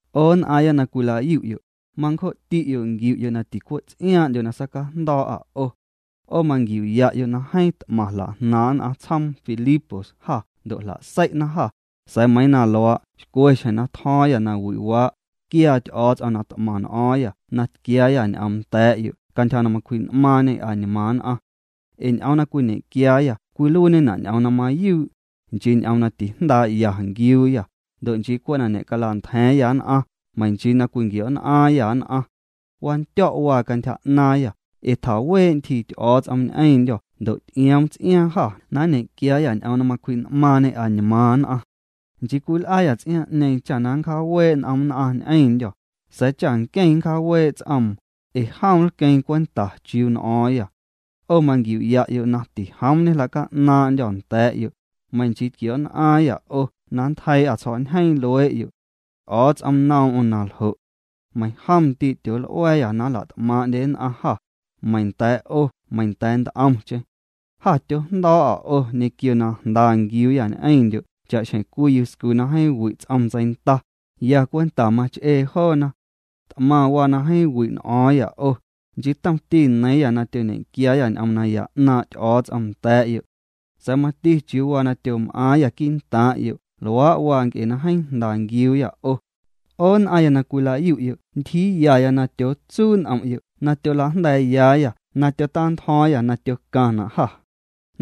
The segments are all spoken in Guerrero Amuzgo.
'O nn'aaⁿya na cwila'yu'yo', mancjo'ti'yo' nquiu'yo' na ticwe' ts'iaaⁿ'ndyo na sacajndo̱o̱'â 'o. 'O manquiu'ya'yo' na jeeⁿ t'maⁿ jla'jnaaⁿ' nn'aⁿ tsjoom Filipos jâ ndo' jla'sei'na jâ, sa̱a̱ meiiⁿ na luaa', xcwe xjeⁿ na tjo̱o̱ⁿyâ nawi'waa', tquiaa Ty'o̱o̱ts'om na t'maⁿ n'o̱o̱ⁿyâ na tquiaayâ ñ'oom nda̱a̱'yo' cantyja na macwji'n'maaⁿñê añmaaⁿ nn'aⁿ. Ee ñ'oom na cwiñequiaayâ cwiluiiñena' ñ'oom na mayuu', nchii ñ'oom na tijndaa'ya nquiuuyâ, ndo' nchii cwe' na ñe'cala'ntja̱a̱ⁿyâ nn'aⁿ, meiⁿ nchii na cwinquio̱'nn'aaⁿyâ nn'aⁿ. Wandyo̱' waa cantyja 'naaⁿyâ, ee tjawee' ntyjii Ty'o̱o̱ts'om ñ'eⁿndyô̱ ndo' ty'ioom ts'iaaⁿ jâ na nñequiaayâ ñ'oom na macwji'n'maaⁿñê añmaaⁿ nn'aⁿ. Nchii cwil'aayâ ts'iaaⁿ'ñeeⁿ cha na nncjaawee' n'om nn'aⁿ ñ'eⁿndyô̱, sa̱a̱ cha nqueⁿ nncjaawee' ts'oom, ee jom nlqueeⁿ cwenta chiuu n'o̱o̱ⁿyâ. 'O manquiu'ya'yo' na tijoom ñejla'ca'naaⁿ'ndyô̱ nda̱a̱'yo', meiⁿ nchii tquio̱'nn'aaⁿyâ 'o na nntjeii'â tsjo̱'ñjeeⁿ luee'yo'. Ty'o̱o̱ts'om noom'm na ljo'. Meiiⁿjom ndii' tyool'ua̱a̱yâ na nla't'maaⁿ'ndye nn'aⁿ jâ, meiⁿ nda̱a̱' 'o meiⁿ nda̱a̱ nt'omcheⁿ. Jâ tyojndo̱o̱'â 'o ñequio na jnda nquiuuyâ ñ'eⁿndyo' cha'xjeⁿ cwii yuscu na jeeⁿ wi' ts'om ntseinda, ya cwenta mach'ee joona. T'maⁿ waa na jeeⁿ wi' n'o̱o̱ⁿyâ 'o, nchii tomti neiiⁿyâ na tyoñequiaayâ ñ'oom naya 'naaⁿ' Ty'o̱o̱ts'om nda̱a̱'yo' sa̱a̱ mati chiuu waa na tyom'aaⁿyâ quii'ntaaⁿ'yo'. Luaa' waa nc'e na jeeⁿ jnda nquiuuyâ 'o. 'O nn'aⁿya na cwila'yu'yo' tyootsuu' n'om'yo' chiuu na tyola'jnda̱a̱yayâ na nnta'ntjo̱o̱ⁿyâ na tcaⁿna' jâ.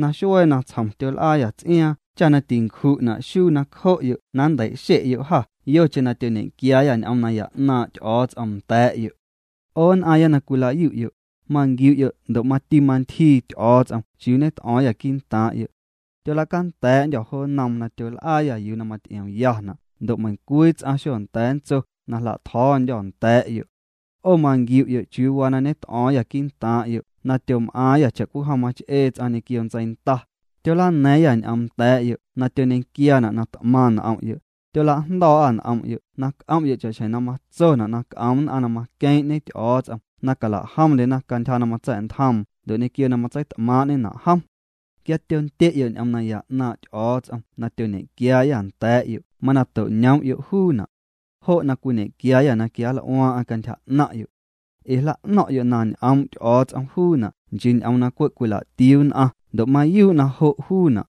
Naxuee natsjom tyol'aayâ ts'iaaⁿ cha tîcatio̱o̱yâ xuu nacjo'yo' na nntei'xe'yo' jâ yocheⁿ na tyoñequiaayâ ñ'oom naya 'naaⁿ' Ty'o̱o̱ts'om nda̱a̱'yo'. 'O nn'aaⁿya na cwila'yu'yo', manquiu'yo' ndo' mati mantyjii Ty'o̱o̱ts'om chiuu ñet'o̱o̱ⁿyâ quii'ntaaⁿ'yo'. Tyola'canda̱a̱'ndyô̱ jo nnoom na tyol'aayâ yuu na maty'iomyana' ndo' meiⁿcwii ts'aⁿ xonda̱a̱ ntso na jla'tjo̱o̱ndyô̱ nda̱a̱'yo'. 'O manquiu'yo' chiuu waa na ñet'o̱o̱ⁿyâ quii'ntaaⁿ'yo' na tyom'aaⁿyâ cha'cwijom mach'ee ts'aⁿ ñequio ntseinda, tyolana̱a̱ⁿyâ ñ'oom nda̱a̱'yo' na tyoñequiaana' na t'maⁿ n'om'yo', tyola'jndo̱o̱'â n'om'yo' na c'om'yo' cha'xjeⁿ na matsona' na c'om nn'aⁿ na maqueeⁿ'ñe Ty'o̱o̱ts'om na calajomndyena cantyja na matsa̱'ntjoom ndo' ñequio na matseit'maaⁿ'ñena' jom. Quia tyondye'yo' ñ'oom naya 'naaⁿ' Ty'o̱o̱ts'om na tyoñequiaayâ nda̱a̱'yo' mana to'ñoom'yo' juuna'. Jo' na cwiñe'quiaayâ na quianl'uaaⁿ'aⁿ cantyja 'naⁿ'yo'. Ee jla'no̱ⁿ'yo' na ñ'oom' Ty'o̱o̱ts'om juuna' nchii ñ'oom na cwe' cwila'tiuu nn'aⁿ. Ndo' mayuu' na jo' juuna'.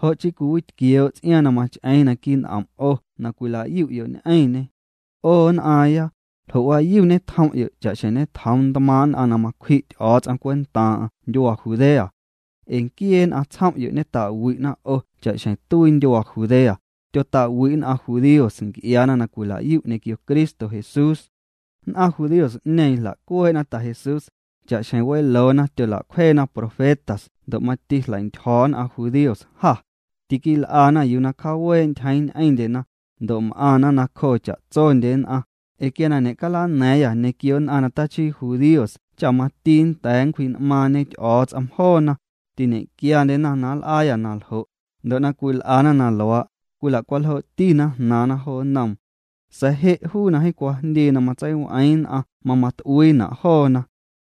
Jo' chii cwiwitquioo' ts'iaaⁿ na mach'eeⁿ naquii' n'om' 'o na cwila'yu'yo' ñ'eⁿñê. 'O nn'aaⁿya, ljo'waayu ñetjom'yo' cha'xjeⁿ ñetjoom ntmaaⁿ' nn'aⁿ na macwji' Ty'o̱o̱ts'om cwentaaⁿ'aⁿ ndyuaa Judea. Ee nquiee nn'aⁿ tsjom'yo' ñeta'wi'na 'o cha'xjeⁿ tuii ndyuaa Judea, tyota'wi' nn'aⁿ judíos nc'iaana na cwilayu' ñequio Cristo Jesús. Nn'aⁿ judíos'ñeeⁿ jla'cuee'na Ta Jesús, cha'xjeⁿ weloona tyola'cwjeena profetas ndo' mati jleintyjo̱ nn'aⁿ judíos jâ. Tiquil'ana yuu na cjaawee' ntyjeeⁿ ñ'eⁿndyena, ndo' m'aⁿna nacjoo cha'tsondye nn'aⁿ, ee quia na ñe'calana̱a̱ⁿyâ ñequio nn'aⁿ na tachii judíos cha mati nnda̱a̱ nncwji'n'maaⁿñe Ty'o̱o̱ts'om joona, tiñe'quiandyena na nl'aayâ na ljo', ndo' na cwil'ana na luaa', cwila'cwaljoo'tina jnaaⁿna jo nnoom. Sa̱a̱ je' juu na jeeⁿ cwajndii na matseiw'eeⁿ nn'aⁿ mama t'uiina' joona.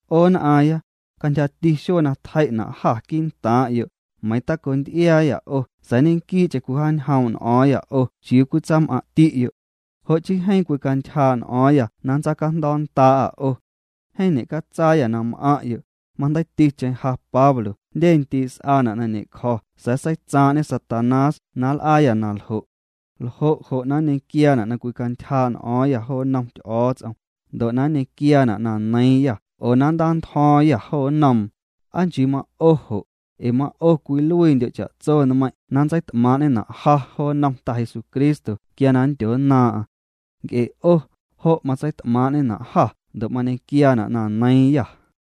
'O nn'aaⁿya, cantyjati xuee na tjei'na' jâ quii'ntaaⁿ'yo', meiiⁿ taconty'iaayâ 'o sa̱a̱ ñequii'cheⁿ cwijaañjoom' n'o̱o̱ⁿyâ 'o chiuu cwitsam'aⁿ'ti'yo'. Jo' chii jeeⁿ cwicantyjaa' n'o̱o̱ⁿyâ na nntsaacajndo̱o̱nnda'â 'o. Jeeⁿ ñe'catsaayâ na m'aⁿ'yo', majndeiiticheⁿ ja Pablo jndye ndii' s'aana' na ñe'cjo̱ sa̱a̱ seitsaaⁿ'ñe Satanás na nl'aayâ na ljo'. ¿Ljo' jo' na nñequiaana' na cwicantyjaa' n'o̱o̱ⁿyâ jo nnom Ty'o̱o̱ts'om, ndo' na nñequiaana' na neiiⁿyâ oo na nntantjo̱o̱ⁿyâ jo nnoom? ¿Aa nchii ma'o jo'? Ee ma'o cwiluiindyo' cha'tso nmeiⁿ' na nntseit'maaⁿ'ñena' ja jo nnom Ta Jesucristo quia na nndyonnaaⁿ'aⁿ. Nc'e 'o, jo' matseit'maaⁿ'ñena' jâ ndo' mañequiaana' na neiiⁿyâ.